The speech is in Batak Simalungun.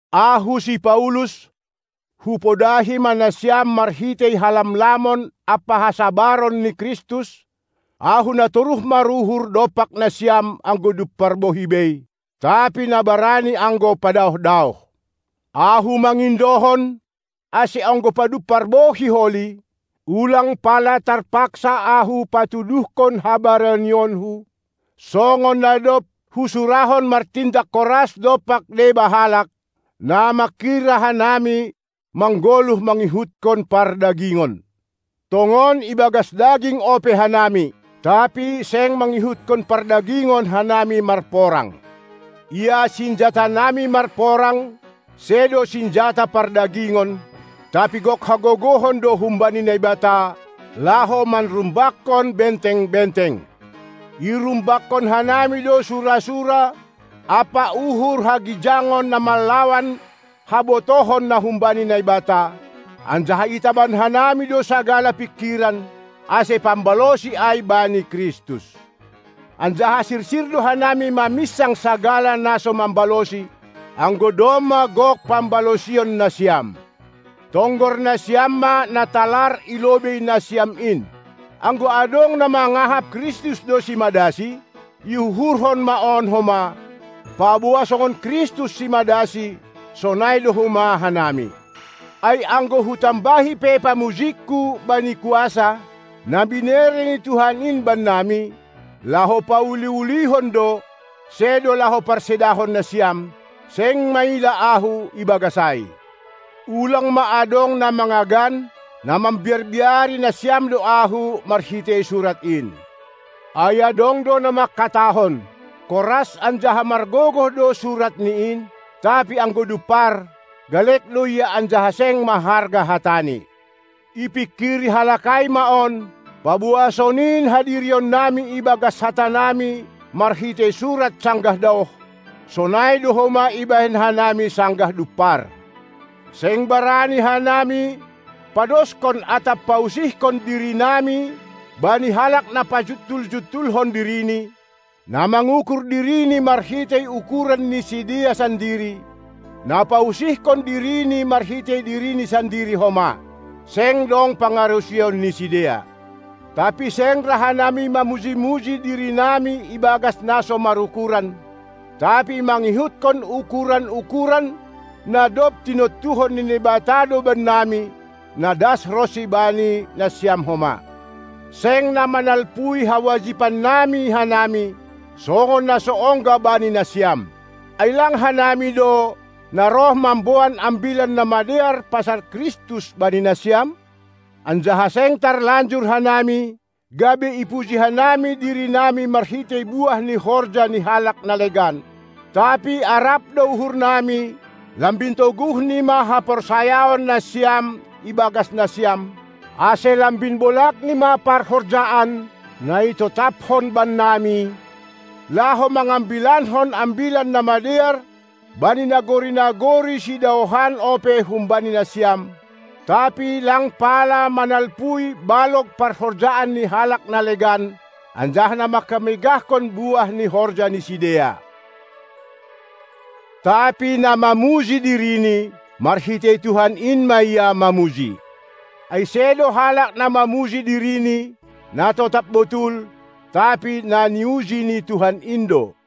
Ahu, si Paulus, hupodahi ma nasiam marhitei halamlamon ampa hasabaron ni Kristus, ahu na toruh maruhur dompak nasiam anggo dumpar bohi bei, tapi na barani anggo padaoh-daoh, ahu mangindohon, ase anggo padumpar bohi holi, ulang pala tarpaksa ahu patuduhkon habaranionku, songon na dob husurahon martindak koras dompak deba halak, na manghira hanami manggoluh mangihutkon pardagingon. Tongon ibagas daging ope hanami, tapi seng mangihutkon pardagingon hanami marporang. Ia sinjatanami marporang sedo sinjata pardagingon, tapi gok hagogohon do humbani Naibata, laho manrumbakkon benteng-benteng. Irumbakkon hanami do sura-sura ampa uhur hagijangon na manlawan habotohon na humbani Naibata, anjaha itaban hanami do sagala pingkiran, ase pambalosi ai bani Kristus. Anjaha sirsir do hanami maminsang sagala naso mambalosi, anggo domma gok pambalosion nasiam. Tonggor nasiam ma na talar i lobei nasiam in! Anggo adong na mangahap, Kristus do simadasi, iuhurhon ma on homa, paboa songon Kristus simadasi, sonai do homa hanami. Ai anggo hutambahi pe pamujingku bani kuasa, na binere ni Tuhan in bannami, laho pauli-ulihon do, sedo laho parsedahon nasiam, seng maila ahu ibagas ai. Ulang ma adong na mangagan, na mambiar-biari nasiam do ahu marhitei surat in. Ai adong do na mangkatahon: Koras anjaha margogoh do suratni in, tapi anggo dumpar, galek do ia anjaha seng maharga hatani. Ipingkiri halak ai ma on, paboa sonin hadirionnami ibagas hatanami marhitei surat sanggah daoh, sonai do homa ibahen hanami sanggah dumpar. Seng barani hanami padoskon atap pausihkon dirinami bani halak na pajuntul-juntulhon dirini, na mangukur dirini marhitei ukuran ni sidea sandiri, na pausihkon dirini marhitei dirini sandiri homa. Seng dong pangarusion ni sidea. Tapi seng ra hanami mamuji-muji dirinami ibagas na so marukuran, tapi mangihutkon ukur-ukuran na dob tinontuhon ni Naibata do bannami, na das ronsi bani nasiam homa. Seng na manalpui hawajibannami hanami, songon na so ongga bani nasiam. Ai lang hanami do, na roh mamboan Ambilan Namadear pasal Kristus bani nasiam? Anjaha seng tarlanjur hanami, gabe ipuji hanami dirinami marhitei buah ni horja ni halak na legan. Tapi arap do uhurnami lambin toguhni ma haporsayaon nasiam ibagas nasiam, ase lambin bolagni ma parhorjaan, na itotapkon bannami, laho mangambilankon Ambilan Namadear bani nagori-nagori sidaohan ope humbani nasiam, tapi lang pala manalpui balog parhorjaan ni halak na legan, anjaha manghamegahkon buah ni horja ni sidea. Tapi na mamuji dirini, marhitei Tuhan in ma ia mamuji! Ai sedo halak na mamuji dirini, na totap botul, tapi na niuji ni Tuhan in do.